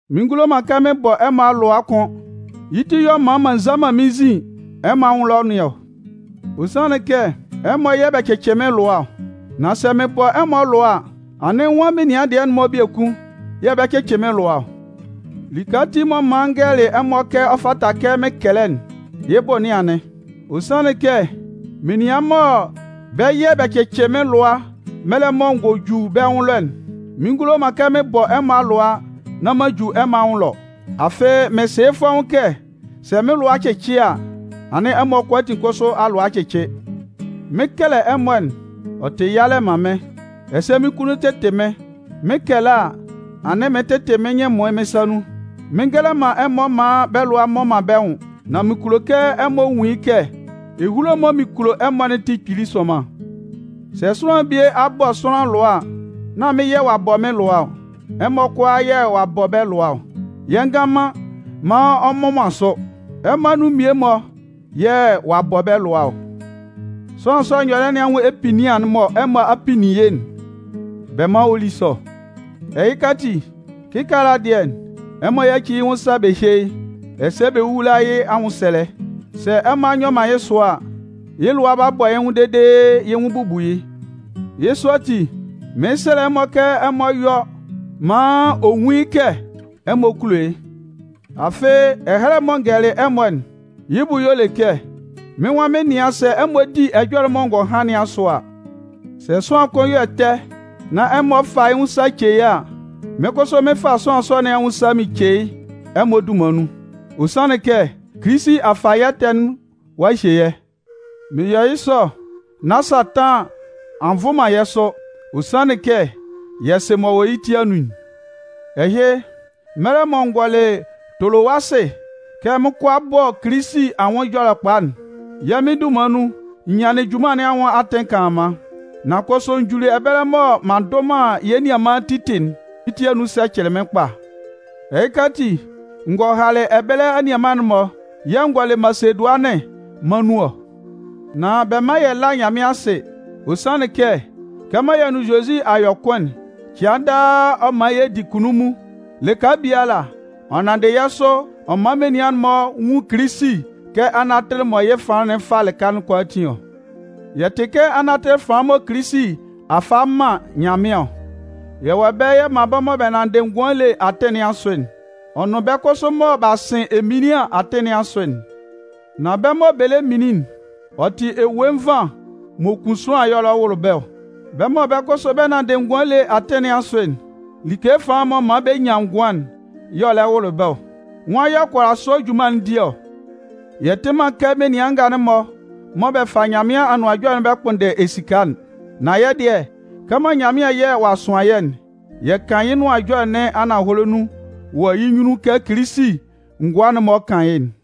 Mɩn ngulo man kɛ mɩn bɔ ɛmɔ alʋa kʋ́n, yɩ́ ti y'ɔ man m'an nza man mɩ́n nzin ɛmɔ anwʋn ɛlɔ nɩn ɔ. Ɔ sanlɩn kɛ ɛmɔ yɛ̂ bɛ cɩcɩ mɩ́n lʋa ɔ. Nan sɛ mɩn bɔ ɛmɔ alʋa a, anɩn nwan menian dɩɛ-mɔ biekun yɛ̂ bɛ 'cɩcɩ mɩ́n lʋa ɔ? Like ati m'ɔ man n gɛlɛlɩ ɛmɔ kɛ ɔ fata kɛ mɩn kɛlɛ'n, yɩ́ bʋ nɩn anɩn. Ɔ sanlɩn kɛ menian mɔ bɛ́ yɛ̂ bɛ 'cɩcɩ mɩn lʋa mɛlɛ mɔ n gɔ ju bɛ́ nwʋn ɛlɔ'n, mɩn ngulo man kɛ mɩn bɔ ɛmɔ alʋa nán m'an ju ɛmɔ anwʋn ɛlɔ. Afɩ mɩn sɩ yɩ́ fɔ́ʋ́n kɛ sɛ mɩ́n lʋa cɩcɩ a, anɩn ɛmɔ kʋalaatin kʋsʋ alʋa a cɩcɩ. Mɩn 'kɛlɛ ɛmɔ'n, ɔ tɩ yalɛ man mɩ́n, ɛsɛ mɩ́n kunnun tɩtɩ mɩ́n. Mɩn 'kɛlɛ a, anɩn mɩɩn tɩtɩ mɩ́n nyɩn ɛmʋɩn mɩ́n sa nun. Mɩɩn ngɛlɛ man ɛmɔ maan bɛ́ lʋa mmɔ man bɛ́ nwʋn, nan mɩn kulo kɛ ɛmɔ nwun yɩ́ kɛ ehulo'n mɔ mɩn kulo ɛmɔ'n tɩ kpili sʋnman. Sɛ sʋanlan bie a bɔ sʋanlan lʋa a, nán mɩ́n yɛ̂ ɔ'a bɔ mɩ́n lʋa ɔ. Ɛmɔ kʋalaa yɛ̂ ɔ'a bɔ bɛ́ lʋa ɔ. Yɛ ngan man maan ɔ mmʋ man sʋ, ɛmɔ anun mmie-mɔ yɛ̂ ɔ'a bɔ bɛ́ lʋa ɔ. Sʋanlan sɔ'n nyɔlɩɛ nɩn anwʋn epinnian'n mɔ ɛmɔ a pinnin yɩ́'n, bɛ mán ɔ lí sɔ. Ɛhɩka ati, kɩkaala dɩɛ, ɛmɔ yáci yɩ́ nwʋn sa bɛ hyé yɩ́, ɛsɛ bɛ wówula yɩ́ anwʋnsɛlɛ. Sɛ ɛmɔ a nyɔ man yɩ́ sɔ a, yɩ́ lʋa 'ba bɔ yɩ́ nwʋn dede yɩ́ nwʋn bubu yɩ́. Yɩ́ sɔ ati, mɩɩn sɛlɛ ɛmɔ kɛ ɛmɔ yɔ́ maan ɔ nwún yɩ́ kɛ ɛmɔ kulo yɩ́. Afɩ, ɛhɛlɛ'n mɔ n gɛlɛlɩ ɛmɔ'n, yɩ́ bʋ y'ɔ le kɛ, mɩ́n nwan mɩn 'nɩan sɛ ɛmɔ di ɛjɔlɛ'n mɔ ngɔ han nɩn asʋ a. Sɛ sʋanlan kʋn yɔ ɛtɛ, nán ɛmɔ fa yɩ́ nwʋn sa ce yɩ́ a, mɩ́n kʋsʋ mɩn fa sʋanlan sɔ nɩn anwʋn sa mɩn ce yɩ́ ɛmɔ dunman nun. Ɔ sanlɩn kɛ Kilisi a fa yɛ́ ɛtɛ'n ɔ'a hye yɛ́. Mɩn yɔ yɩ́ sɔ nán Satan a nvʋ man yɛ́ sʋ. Ɔ sanlɩn kɛ yɛ sɩ m'ɔ wɔ yɩ́ ti anun'n. Ɛhɩ, mɛlɛ mɔ n gɔlɩ Tolowasɩ kɛ mɩn 'kɔ a bɔ Kilisi anwʋn Ɛjɔlɛkpa'n, yɛ́ Mɩn dunman nun, n nyanlɩn junman nɩn anwʋn atɩn kanlanman. Nan kʋsʋ n juli ɛbɛlɛ mɔ m'an ndʋ man yɛ́ nianman Titɩ'n, mɩ́n ti anun sɛcɛlɩ mɩ́n kpa. Ɛhɩka ati, n gɔ halɩ ɛbɛlɛ anianman'n-mɔ yɛ̂ n gɔlɩ Masedʋanɩn mân nun ɔ. Nan bɛ mán yɛ lá Nyanmɩan asɩ, ɔ sanlɩn kɛ kɛmɔ yɛ nʋn Zozi a yɔ kʋn'n, cɩan daa ɔ man yɛ di kunnunmun. Lɩka biala, ɔ nanndɩ yɛ́ sʋ ɔ man menian'n-mɔ nwun Kilisi kɛ anatɩlɩ mɔ yɩ́ fanlan'n fa lɩka kʋalaatin ɔ. Yɛ́ tɩ kɛ anatɩlɩ fanlan mɔ Kilisi a fa a man Nyanmɩan ɔ. Yɛ wɔ ɛbɛlɛ yɛ man bɛ́ mɔ bɛ nanndɩ ngʋan ele atɩn nɩn asʋ'n, ɔ nʋn bɛ́ kʋsʋ mɔ b'a sɩn eminlian atɩn nɩn asʋ'n. Nan bɛ́ mɔ bɛ lɛ minlin'n, ɔ tɩ ewue nvan m'ɔ kun sʋanlan y'ɔ lɛ wʋlʋ bɛ́ ɔ. Bɛ́ mɔ bɛ́ kʋsʋ bɛ nanndɩ ngʋan ele atɩn nɩn asʋ'n, like fanlan m'ɔ man bɛ nyan ngʋan, y'ɔ lɛ wʋlʋ bɛ́ ɔ. Nwan y'ɔ kʋala sɔ junman'n di ɔ? Yɛ tɩ man kɛ menian nga'n-mɔ mɔ bɛ fa Nyanmɩan Anʋan Ɛjɔlɛ'n bɛ kpʋnndɛ bɛ́ esika'n. Nan yɛ́ dɩɛ, kɛmɔ Nyanmɩan yɛ̂ ɔ'a sʋan yɛ́'n, yɛ kan yɩ́ Nʋan Ɛjɔlɛ nɩn ananhɔlɛ nun wɔ yɩ́ nyunnun kɛ Kilisi ngʋa'n-mɔ kan yɩ́'n.